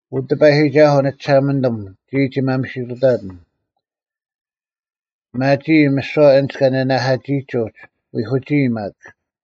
ᐅ ᑎᐸᔨᒋᒐᓱᐤ, ᓂᒋᓴᒪᓂᑐᒻ, ᒋᔾ ᒋ ᒪᒥᓯᑐᑕᑎᓐ: ᐱᒪᒋᐃ ᒥᓯᐛ ᐊᓐᒡ ᑲ ᓂᓇᐧᑲᒋᐃᒡ ᐅᒡ, ᐎᒂᒋᐃ ᒪᒃ: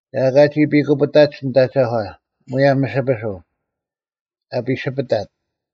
ᒐ ᐊᑲ ᒋ ᐱᑯᐱᑕᑦ ᓂᑦ ᐊᒐᒂ ᒧᔭᒻ ᒥᓯᐱᓱᐤ, ᐊ ᐱᓯᐱᑕᑦ,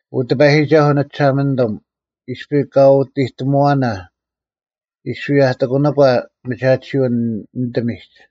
ᐅ ᑎᐸᔨᒋᒐᓱᐤ ᓂᒋᓴᒪᓂᑐᒻ, ᐃᔅᐱ ᐅ ᑲ ᐃᑐᑎᒧᐛᓇ; ᐃᔅᐱ ᐊᑎᑯᓄᒂ ᒥᒐᑎᓯᐅᓐ ᓂᑎᒋᒡ;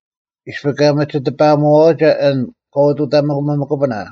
ᐃᔅᐱ ᑲ ᒥᒋ ᑎᐸᐊᒧᐛᐛᒐ ᐊᓐ ᑲ ᐅᑐᑕᒥᒥᑯᐱᓇ;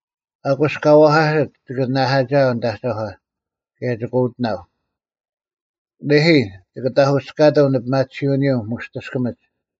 ᐊᑯᔅ ᑲ ᐛᐧᑲᓯᑦ ᒋᑭ ᓇᓇᐧᑲᒋᐊᐤ ᓂᑦ ᐊᒐᒂ, ᑭᔭ ᒋᑭ ᐅᑎᓇᐤ; ᓂᐦᐃ, ᒋᑭ ᑕᑯᔅᑲᑎᒻ ᓂᐱᒪᑎᓯᐅᓂᔪᐤ ᒧᔅᑎᔅᑲᒥᒡ,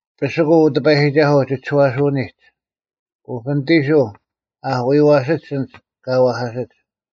ᐱᓯᑯᐤ, ᐅ ᑎᐸᔨᒋᒐᓱᐤ, ᒋ ᒋᔄᓯᐅᓂᒡ, ᐅᐱᓂᑎᓱᐤ ᐊ ᐊᐧᑯᔪᐛᓯᒡ ᐊᓐᒡ ᑲ ᐛᐧᑲᓯᒡ: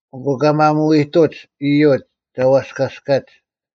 ᐊᑯ ᑲ ᒪᒧᐎᔨᑐᒡ ᐃᔪᒡ ᒐ ᐛᔅᑲᔅᑲᔅᒡ: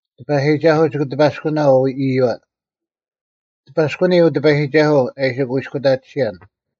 ᑎᐸᔨᒋᒐᓱᐤ ᒋᑭ ᑎᐸᔅᑯᓇᐤ ᐃᔪᐛ: ᑎᐸᔅᑯᓂ ᐅ ᑎᐸᔨᒋᒐᓱᐤ, ᐊ ᐃᓯ ᑯᐃᔅᑯᑕᑎᓯᔭᓐ,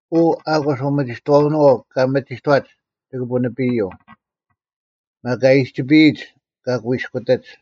ᐅ, ᐊᑯᔅ ᐅᒥᒋᑥᐅᓄᐛᐤ ᑲᒥᒋᑥᒡ ᒋᑭ ᐳᓂᐱᔪᐤ; ᒪᒃ ᐊᔨᒋᐃᒡ ᑲ ᑯᐃᔅᑯᑎᒡ: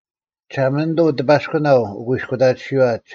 ᒋᓴᒪᓂᑐᐤ ᑎᐸᔅᑯᓇᐤ ᐅᑯᐃᔅᑯᑕᑎᓯᐛ,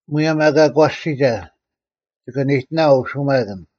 ᒧᔭᒻ ᐊᑲ ᒂᔅᒋᒐ, ᒋᑭ ᒋᓂᑕᐤ ᐅᓯᒪᑭᓐ;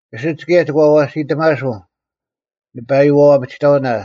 ᐊᓯᒡ ᑭᔭ ᒋ ᐛᐛᓯᑕᒪᓱᐤ ᓂᐸᔪᐛᐤ ᐊᐱᒋᑕᑭᓇ;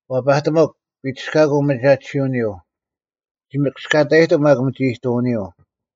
ᐛᐸᑎᒧᒄ, ᐱᒋᔅᑲᑯᐤ ᒪᒐᑎᓯᐅᓂᔪᐤ, ᒋ ᒋᒥᔅᑯᐛᔭᔨᑎᒻ ᒪᒃ ᒥᒋᐃᑐᐅᓂᔪᐤ,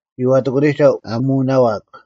ᒋ ᐛᑎᑯᓂᒐᐤ, ᐊ ᒧᓇᐊᐧᒃ,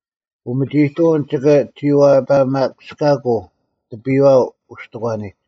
ᐅᒥᒋᐃᑐᐅᓐ ᒋᑭ ᒋᐛᐸᑲᒥᔅᑲᑯᐤ ᑎᐱᔨᐛ ᐅᔅᑎᒂᓂᒡ,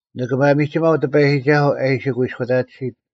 ᓂᑭ ᒪᒥᒋᒪᐤ ᑎᐸᔨᒋᒐᓱᐤ ᐊ ᐃᓯ ᑯᐃᔅᑯᑕᑎᓯᑦ: